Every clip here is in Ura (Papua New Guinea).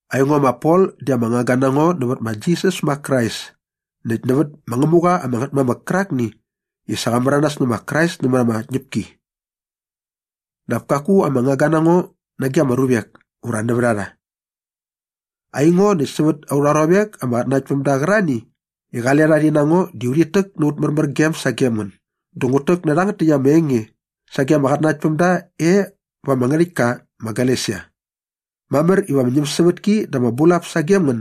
Aingo ma Pol di ama ngangga na ngo nävät ma Jisas ma Krais näkt nävät ma Ngämuqa ama Ngätmamäk kärakni i sa qa märanas nä ma Krais nämät ama tñäpki. Dap kaku ama ngangga na ngo nage ama ruvek ura nävät a rha. Aingo näkt sävät aurha ruavek ama qatnanaktpämda qärarhani i qale rha rhi na ngo di urhit täk na aut märmärgem sagem ngän dä ngut täk nä rhangät täkt ama enge sage ama qatnanaktpämda e va ama ngärhäktka ma Galesia. Mamär iva ama ñämsävätki dä ama bulap sagem ngän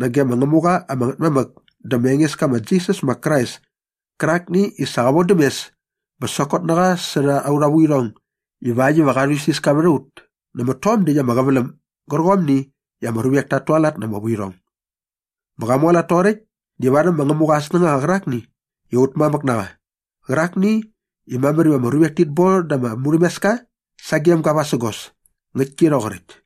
nage ma Ngämuqa ama Ngätmamäk dä ma Engeska ma Jisas ma Krais kärakni i sa qa vodäm mes bä sokot na qa särha aurha vuirhong ivakt iva qa rhuisiska vät a ut nämät tom däkt ama qäväläm gärqomni i ama ruvek tat tualat na ama vuirhong. Bä qa mualat toqoräkt di varhäm ma Ngämuqa aa snängaqa qärakni i aut mamäk na qa qärakni i mamär iva ama ruvek tit bon da ama murhämeska sagem ga vasägos. Ngäktki rhoqoräkt.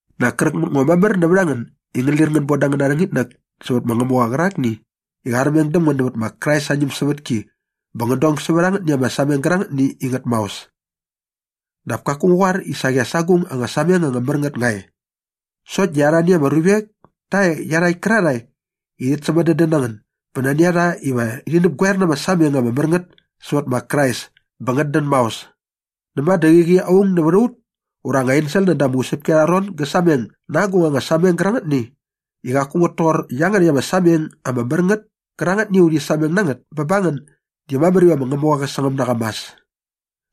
Nak kräk mät ngo mamär nävät a ngän i ngän lir ngän bon da angäna rhängitnäk sävät ma Ngämuqa qärakni i qa armeng däm ngän nävät ma Krais aa ñämsävätki bä ngän dong sävät angätni ama sameng gärangätni i ngät maos. Dap kaku ngu qoar i saqi as agung anga sameng anga mär ngät nga e. Sokt di arhani ama ruvek ta e iarhakt kärarhae i rhit sämadädän na ngän bä nani a rha iva rhi näpgoer na ama sameng ama mär ngät sävät ma Krais bä ngät dän maos. Näma dä qäqi aung nävät a ut ura anga ensel näda ama usäpki arha ron gä sameng na agung anga sameng gärangätni i qaku ngät toqor iangärhäkt ama sameng ama mär ngät kärangätni i sa ut sameng na ngät bä ba ngän di mamär iva ma Ngämuqa qä sangäm na qa mas.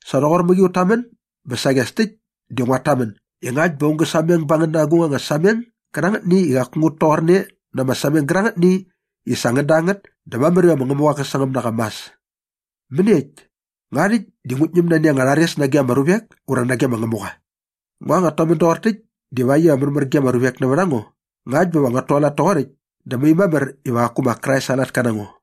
Sa rhoqor mäqi ut tamän bä saqi as täkt di nguat tamän i ngakt bä aung gä sameng ba ngän na agung anga sameng gärangätni i qaku ngät toqorne na ama sameng gärangätni i sa ngän da ngät dä mamär iva mä Ngämuqa qä sangäm na qa mas. Mäniekt? Nga rhäkt di ngut ñäm nani anga rhares nage ama ruvek ura nage ma Ngämuqa? Nga nguat tamän doqor täkt divakt iva märmär ge ama ruvek nävät a ngo? Ngakt bä va nguat tualat toqoräkt dä mai mamär iva qaku ma Krais aa latka na ngo.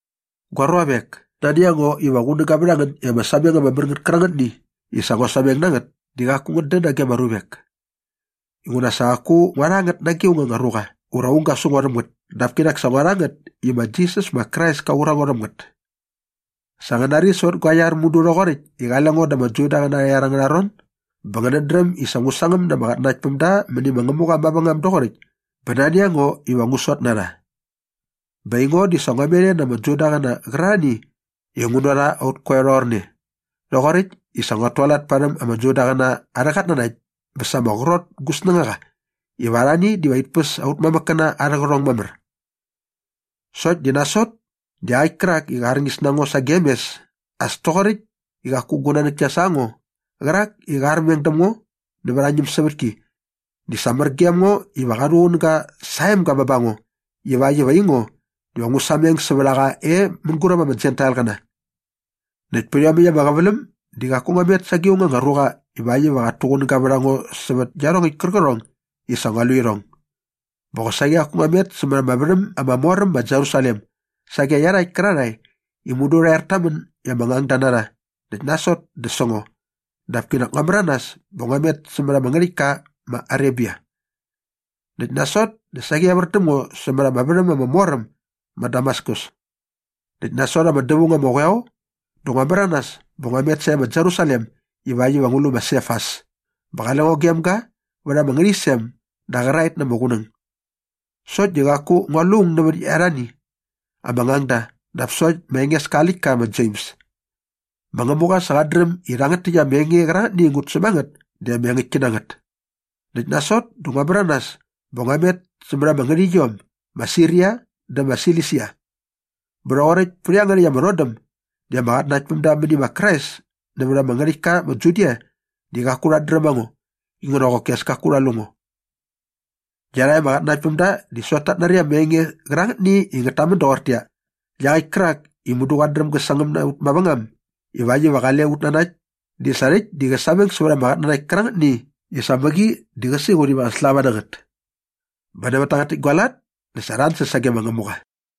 Gua ruavek, nani a ngo iva qunäga vät a ngän i ama sameng ama mär ngät kärangätni i sa ngua sameng na ngät di qaku ngät dän nage ama ruvek. Inguna sa qaku ngua rha ngät nage aung anga ruqa ura aung ga su ngo rhäm ngät dap kinak sa ngua rha ngät i ma Jisas ma Krais ka qur a ngo rhäm ngät. Sa ngän nari sävät gua iar mudu rhoqoräkt i qale ngo da ama Judaqäna arha iar angärha ron bä ngänät dräm i sa ngu sangäm na ama qatnanaktpämda mäni ma Ngämuqa mavängam doqoräkt bä nani a ngo iva ngu sot na rha. Bä aingo di sa ngua met e na ama Judaqäna qärarhani i ngu na rha ut koeo rhoqorne rhoqoräkt i sa nguat tualat parhäm ama Judaqäna arhä qatnanakt bä sa ama qrot gu snängaqa iva arhani diva rhit päs aut mamäkkäna arhä qärhong mamär. Sokt di nasot dä iaqäkt kärak i qa arñis na ngo sagem mes as toqoräkt i qaku gu nanäk kia sa ngo qärak i qa armeng däm ngo nävät aa ñämsävätki di sa mär gem ga iva qa rhuqunäga sa aa emga bä ba ngo ivakt iva aingo diva ngu sameng sävät a qa e mänguräp ama Jentailqäna. Näkt pät iomäkt ama qäväläm di qaku ngua met sage aung anga ruqa ivakt iva qat tuqunäga vät a ngo sävät iarhongäkt kärqärhong i sa ngua lu irhong. Bä qosaqi qaku ngua met sämät ama värhäm ama mor äm ma Jerusalem sage iarhakt kärarhae i mudu rha er ta män i ama ngangda na rha näkt nasot dä sä ngo dap kinak ngua märanas bä ngua met sävät ama ngärhäktka ma Arebia. Näkt nasot dä saqi evär däm ngo sämät ama värhäm ama mor äm ma Damaskus. Näkt nasot ama dävaung ama qoeo dä ngua märanas bä ngua met sae ma Jerusalem ivakt iva ngu lu ma Sefas bä qale ngo e gem ga vät ama ngärhäqyisem da qäraet na ama qunäng. Sokt di qaku ngua lu aung nävät arhani ama ngangda dap sokt ma Engeska aa läktka ma Jems. Ma Ngämuqa sa qat dräm i rhangät täkt ama enge qärangätni i ngut säm a ngät di ama engäktki na ngät. Näkt nasot dä ngua märanas bä ngua met sävät ama ngärhäqyiom ma Siria dä ma Silisia. Bä rhoqoräkt pät iangärhäkt ama rhodäm di ama qatnanaktpämda mäni ma Krais nävät ama ngärhäktka ma Judia di qaku rhat dräm a ngo inguna qoki as kaku rha lu ngo. Iarhakt ama qatnanaktpämda di sokt tat nari ama enge qärangätni i ngät tamän doqortäqyia, “Iaqäkt kärak i mudu qat dräm gä sangäm na ut mavängam ivakt iva qale ut nanakt di sa rhäkt di qä sameng sävät ama qatnanakt kärangätni i sa mäqi di qä siqut iva qä slava na ngät.” Bä nävät tangät täkt gua lat dä sa rha ansäs sage ma Ngämuqa.